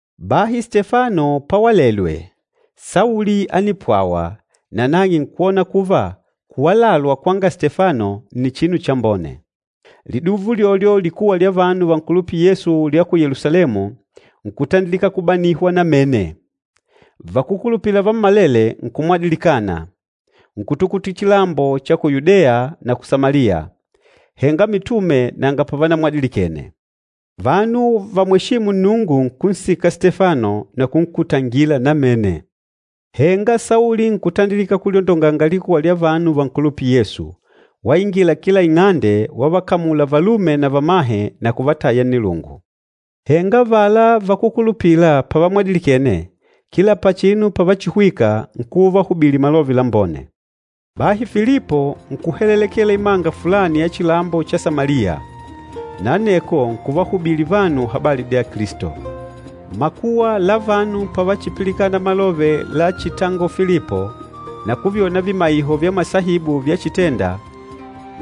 Bahi Stefano pawalelwe, Sauli ánipwawa nanang'e nkwona kuva kuwalalwa kwanga Stefano nni chinu chambone. Liduva ulyolyo likuwa lya vanu vankulupîla Yesu lya ku Yelusalemu nkutandilika kubanihwa namene. Vakúkulupila vammalele nkumwadilikana, nkutukutila chilambo cha ku Yudeya na ku Samaliya. Henga mitume nanga pavanamwadilikene. Vanu vamweshîmu Nnungu nkunsika Stefano na kunkutangila namene. Henga Sauli nkutandilika kulyondonganga likuwa lya vanu vankulupîla Yesu, waingila kila ing'ande wavakamula valume na vamahe na kuvataya nnilungu. Henga avala vakúkulupila pavamwadilikene, kila pachinu pavachihwika nkuva uvahubili Malove Lambone. Bahi Filipo nkuhelelekela imanga fulani ya chilambo cha Samaliya, na aneko nkuvahubili vanu habali dya Kilisto. Makuwa la vanu pavachipilikana malove lachitangola Filipo na kuvyona vimaiho vya masaibu vyachitenda,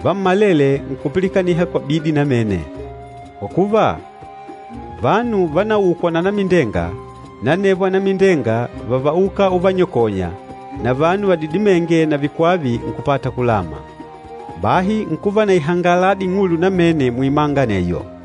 vammalele nkupilikaniha kwa bidi namene. Kwa kuva, vanu vanaukwa na anamindenga na anevo anamindenga vávauka uvanyakonya, na vanu vadidimênge na vikwava nkupata kulama. Bahi nkuva na ihangaladi ing'ulu namene muimanga aneyo.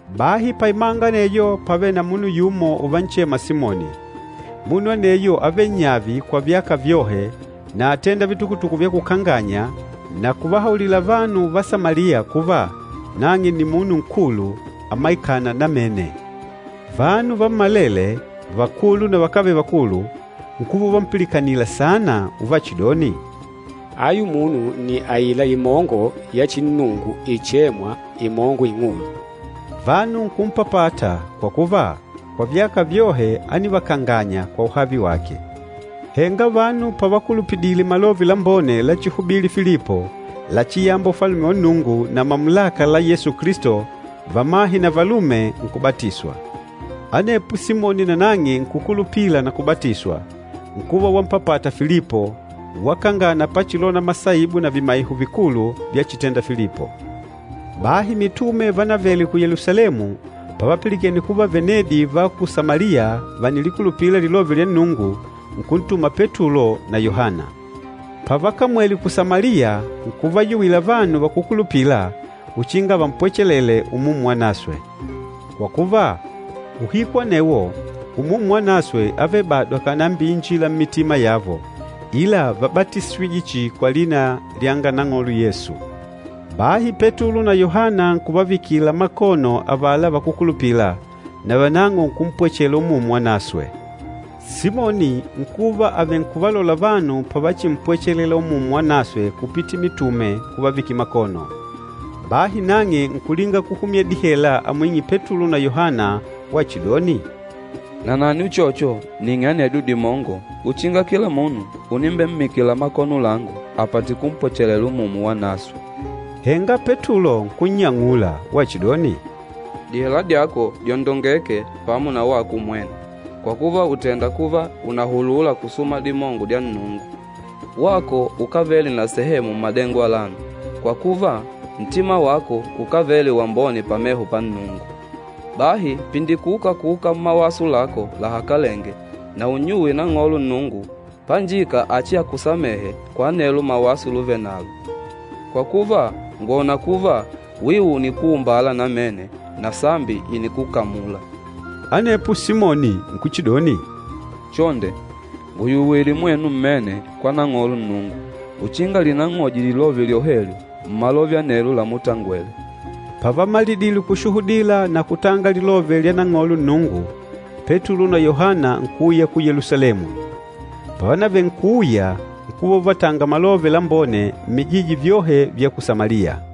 Bahi paimanga aneyo pávele na munu yumo uvanchema Simoni. Munu aneyo ávele nyavi kwa vyaka vyohe na átenda vitukutuku vyakukanganya na kuvahaulila vanu va Samaliya kuva nang'e nni munu nkulu, amaikâna namene. Vanu vammalele, vakulu na vakávele vakulu, nkuva uvampilikanila saana uvachidoni, “Ayu munu nni aila imongo ya chinnungu ichêmwa, ‘Imongo Ing'ulu.’” Vanu nkumpapata kwa kuva, kwa vyaka vyohe ánivakanganya kwa uhavi wake. Henga vanu pavakulupidile Malove Lambone lachihubili Filipo, lachiyamba Ufalume wa Nnungu na mamulaka la Yesu Kilisto, vamahe na valume nkubatiswa. Anepo Simoni nanang'e nkukulupila na kubatiswa, nkuva wampapata Filipo, wakangana pachilona masaibu na vimaiho vikulu vyachitenda Filipo. Bahi mitume vanavele ku Yelusalemu pavapilikene kuva venedi va ku Samaliya vànilikulupila Lilove lya Nnungu, nkuntuma Petulo na Yohana. Pavakamwele ku Samaliya nkuvayuwila vanu vakúkulupila uchinga vampwechelele Umumu Wanaswe. Kwa kuva, uhiku anewo Umumu Wanaswe ávele bado akànambiinjila mmitima yavo, ila vábatisijwe chihi kwa lina lyanga Nang'olo Yesu. Bahi Petulo na Yohana nkuvavikila makono avala vakúkulupila, navanang'o nkumpwechela Umumu Wanaswe. Simoni nkuva avenkuvalola vanu pavachimpwechelela Umumu Wanaswe kupitila mitume kuvavikila makono. Bahi nang'e nkulinga kuhumya dihela amwing'e Petulo na Yohana wachidoni, “Nanani uchocho ning'e anedyo dimongo uchinga kila munu unimbemmikila makono langu apate kumpwechelela Umumu Wanaswe.” Henga Petulo nkunnyang'ula wachidoni, “Dihela dyako dyondongeke pamo na wako umwene, kwa kuva ùtenda kuva unahulula kusuma dimongo dya Nnungu! Wako ukávele na sehemu mmadengo alano, kwa kuva, ntima wako ukávele wambone pameho pa Nnungu. Bahi pindikuka kuuka mmawaso lako lahakalenge na unnyuwe Nang'olo Nnungu, panjika achiakusamehe kwa anelo mawaso luvenalo. Kwa kuva, ngwòna kuva wiu unikuumbala namene na sambi ìnikukamula.” Anepo Simoni nkuchidoni, “Chonde, nguyuwile mwenu mmene kwa Nang'olo Nnungu uchinga linang'oje lilove lyohelyo mmalove anelo lamutangwele.” Pavamalidile kushuhudila na kutanga Lilove lya Nang'olo Nnungu, Petulo na Yohana nkuuya ku Yelusalemu. Pavanavenkuuya nkuva uvatanga Malove Lambone mmijiji vyohe vya ku Samaliya.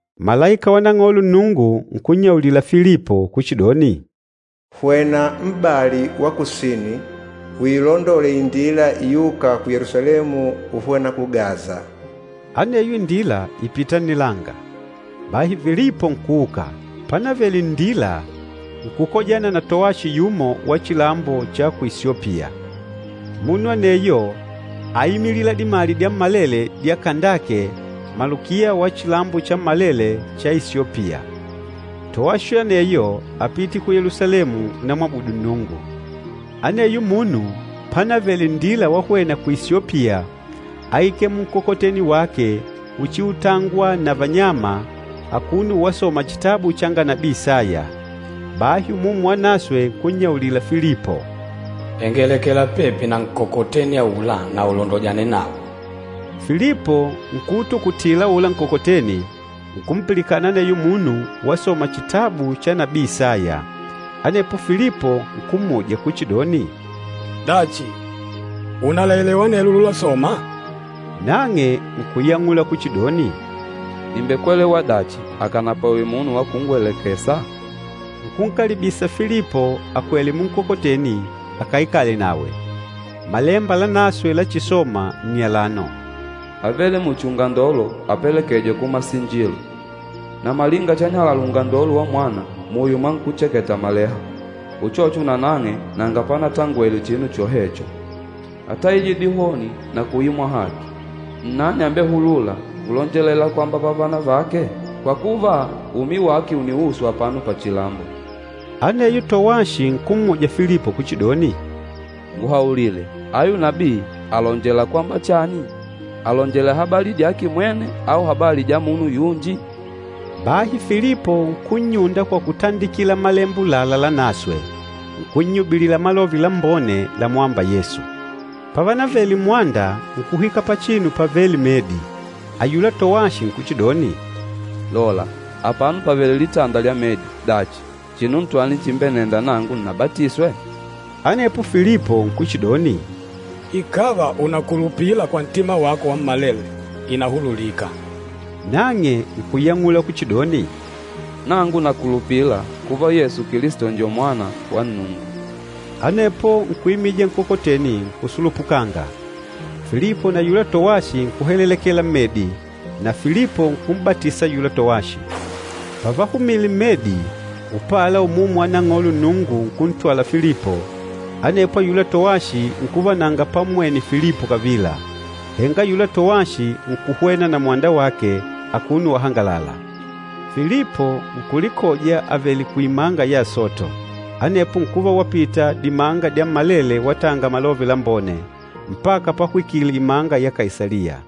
Malaika wa Nang'olo Nnungu nkunyaulila Filipo kuchidoni, “Hwena m'bali wa kusini uilondole indila iûka ku Yelusalemu uhwena ku Gaza.” Aneyo indila ìpita nnilanga. Bahi Filipo nkuuka. Panavele nndila, nkukojana na towashi yumo wa chilambo ku Isyopiya. Munu aneyo áimilila dimali dyammalele dya Kandake, malukiya wa chilambo chammalele cha Isyopiya. Towashi aneyo ápite ku Yelusalemu unamwabudu Nnungu. Aneyo munu panavele nndila wahwena ku Isyopiya áikele munkokoteni wake uchiutangwa na vanyama akuno wasoma chitabu changa nabii Isaya. Bahi Umumu Wanaswe nkunnyaulila Filipo, “Hengelekela pepi na nkokoteni aula na ulondojane nawo.” Filipo nkuutukutila aula nkokoteni, nkumpilikana aneyo munu wasoma chitabu cha nabii Isaya. Anepo Filipo nkummuja kuchidoni, “Dachi, unalaelewa anelo lulasoma?” Nang'e nkuyang'ula kuchidoni, “Nìmbekwelewa dachi akànapwawe munu wa kungwelekesa?” Nkunkalibisa Filipo akwele munkokoteni akaikale nawe. Malemba Lanaswe lachisoma nni alano, “Ávele muchi ungandolo apelekêjwa kumasinjilo. Na malinga chanyalala ungandolo wa mwana muyo mwa nkúcheketa maleha, uchocho nanang'e nanga panatangwele chinu chohecho. Átaijwe dihoni na kuimwa haki. Nnani ambehulûla kulonjelela kwamba vavana vake? Kwa kuva, umi wake uniuswa apano pachilambo.” Aneyo towashi nkummuja Filipo kuchidoni, “Nguhaulile, ayu nabii àlonjelela kwamba chani? Àlonjelela habali dyake mwene au habali dyanga munu yunji?” Bahi Filipo nkunnyunda kwa kutandikila Malemba ulala Lanaswe, nkunnyubilila Malove Lambone lamwâmba Yesu. Pavanavele mmwanda, nkuhwika pachinu pavêle medi, ayula towashi nkuchidoni, “Lola, apano pàvele litanda lya medi. Dachi, chinu ntwani chimbenenda nangu nnabatiswe?” [ Anepo Filipo nkuchidoni, “Ikàva unakulupila kwa ntima wako wammalele, ìnahululika.” Nang'e nkuyang'ula kuchidoni, “Nangu nakulupila kuva Yesu Kilisto njo Mwana wa Nnungu.”] Anepo nkuimija nkokoteni nkusulupukanga. Filipo na ayula towashi nkuhelelekela mmedi, na Filipo nkum'batisa ayula towashi. Pavahumile mmedi, upala Umumu wa Nang'olo Nnungu nkuntwala Filipo, anepo ayula towashi nkuva nanga pammwene Filipo kavila. Henga ayula towashi nkuhwena na mwanda wake akuno wahangalala. Filipo nkulikoja avèlè kuimanga ya Asoto. Anepo nkuva wapita dimanga dyammalele watanga Malove Lambone, mpaka pahwikile imanga ya Kaisaliya.